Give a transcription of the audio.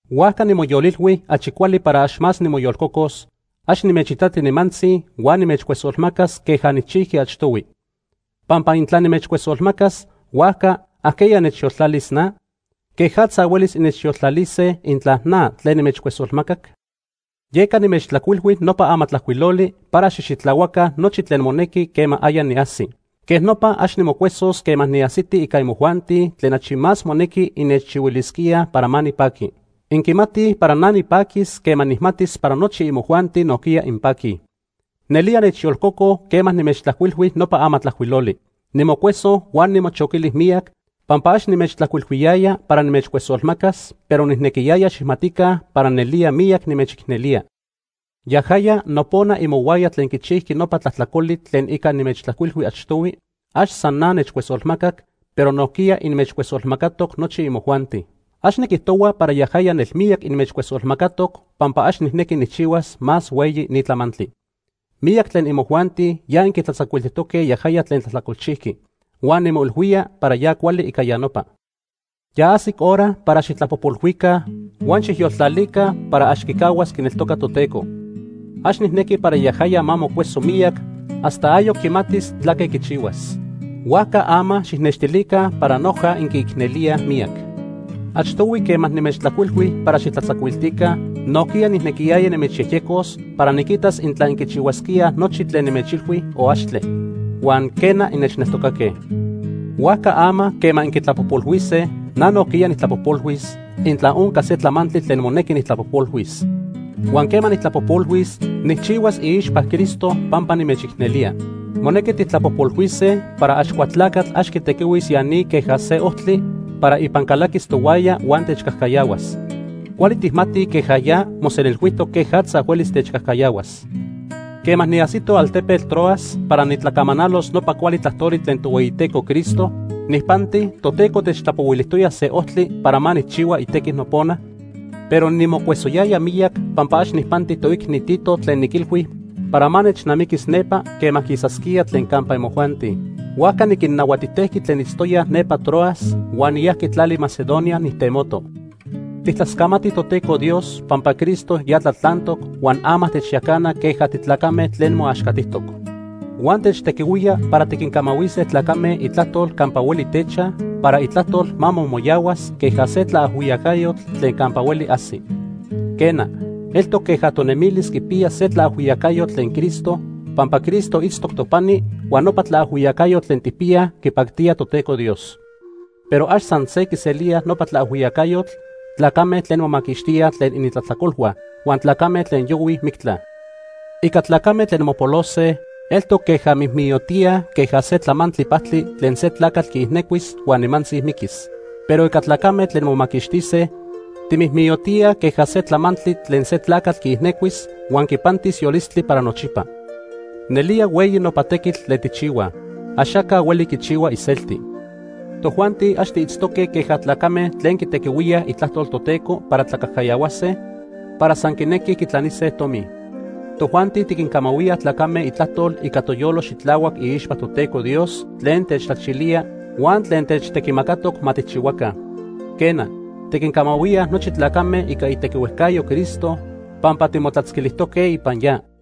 Huajca nimoyolilhui achi cuali para ax más nimoyolcocos, ax nimechitati nimantzi huan nimechcuesolmacas queja nijchijqui achtohui. Pampa intla nimechcuesolmacas, huajca ¿ajqueya nechyoltlalis na? ¿Quejatza huelis innechyoltlalise intla na tlen nimechcuesolmacac? Yeca nimechtlajcuilhui nopa amatlajcuiloli para xijxitlahuaca nochi tlen monequi quema aya niajsi. Quej nopa ax nimocuesos quema niajsiti ica imojuanti tlen achi más monequi innechchihuilisquíaj para ma nipaqui. Inquimatij para na nipaquis quema nijmatis para nochi imojuanti nojquiya inpaquij. Nelía nechyolcoco quema nimechtlajcuilhui nopa amatlajcuiloli. Nimocueso huan nimochoquili miyac, pampa ax nimechtlajcuilhuiyaya para nimechcuesolmacas, pero nijnequiyaya xijmatica para nelía miyac nimechicnelía. Yajaya nopona imohuaya tlen quichijqui nopa tlajtlacoli tlen ica nimechtlajcuilhui achtohui, ax san na nechcuesolmacac, pero nojquiya inmechcuesolmacatoc nochi imojuanti. Ax niquijtohua para yajaya nelmiyac inmechcuesolmacatoc pampa ax nijnequi nijchihuas más hueyi ni tlamantli. Miyac tlen imojuanti ya inquitlatzacuiltijtoque yajaya tlen tlajtlacolchijqui. Huan nimoilhuía para ya cuali ica ya nopa. Ya ajsic hora para xijtlapojpolhuica huan xijyoltlalica para ax quicahuas quineltoca Toteco. Ax nijnequi para yajaya ma mocueso miyac hasta ayoc quimatis tlaque quichihuas. Huajca ama xijnextilica para noja inquiicnelíaj miyac. Achtohui quema nimechtlajcuilhui para xijtlatzacuiltica, nojquiya nijnequiyaya nimechyejyecos para niquitas intla inquichihuasquíaj nochi tlen nimechilhui o axtle. Huan, quena, innechneltocaque. Huajca ama quema inquitlapojpolhuise, na nojquiya nijtlapojpolhuis, intla onca se tlamantli tlen monequi nijtlapojpolhuis. Huan quema nijtlapojpolhuis, nijchihuas iixpa Cristo pampa nimechicnelía. Monequi tijtlapojpolhuise para Axcualtlacatl ax quitequihuis ya ni queja se ojtli para ipan calaquis tohuaya huan techcajcayahuas. Cuali tijmatij queja ya mosenilhuijtoc quejatza huelis techcajcayahuas. Quema niajsito altepetl Troas para nitlacamanalos nopa cuali tlajtoli tlen Tohueyiteco Cristo, nijpanti Toteco techtlapohuilijtoya se ojtli para ma nijchihua itequi nopona, pero nimocuesoyaya miyac pampa ax nijpanti toicni Tito tlen niquilhui para ma nechnamiquis nepa quema quisasquía tlen campa imojuanti. Huajca niquinnahuatijtejqui tlen itztoyaj nepa Troas huan niyajqui tlali Macedonia nijtemoto. Tijtlascamatij Toteco Dios pampa Cristo ya tlatlantoc huan ama techyacana queja titlacame tlen moaxcatijtoc. Huan techtequihuía para tiquincamahuise tlacame Itlajtol campa hueli techaj, para Itlajtol ma momoyahuas queja se tlaajhuiyacayotl tlen campa hueli ajsi. Quena, eltoc queja tonemilis quipiya se tlaajhuiyacayotl tlen Cristo pampa Cristo itztoc topani huan nopa tlaajhuiyacayotl tlen tijpiyaj quipactía Toteco Dios. Pero ax san se quiselíaj nopa tlaajhuiyacayotl tlacame tlen momaquixtíaj tlen inintlajtlacolhua huan tlacame tlen yohuij mictla. Ica tlacame tlen mopolose, eltoc queja timijmiyotíaj queja se tlamantli pajtli tlen se tlacatl quiijnecuis huan nimantzi miquis. Pero ica tlacame tlen momaquixtise, timijmiyotíaj queja se tlamantli tlen se tlacatl quiijnecuis huan quipantis yolistli para nochipa. Nelía hueyi nopa tequitl tlen tijchihuaj. Axaca hueli quichihua iselti. Tojuanti ax tiitztoque queja tlacame tlen quitequihuíaj Itlajtol Toteco para tlacajcayahuase para san quinequij quitlanise tomi. Tojuanti tiquincamahuía tlacame Itlajtol ica toyolo xitlahuac iixpa Toteco Dios tlen techtlachilía huan tlen techtequimacatoc ma tijchihuaca. Quena, tiquincamahuía nochi tlacame ica itequihuejcayo Cristo pampa timotlatzquilijtoque ipan ya.